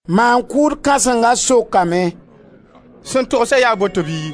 Maan-kʋʋd kãsenga sokame: «Sẽn togsa yaa boto bɩ?»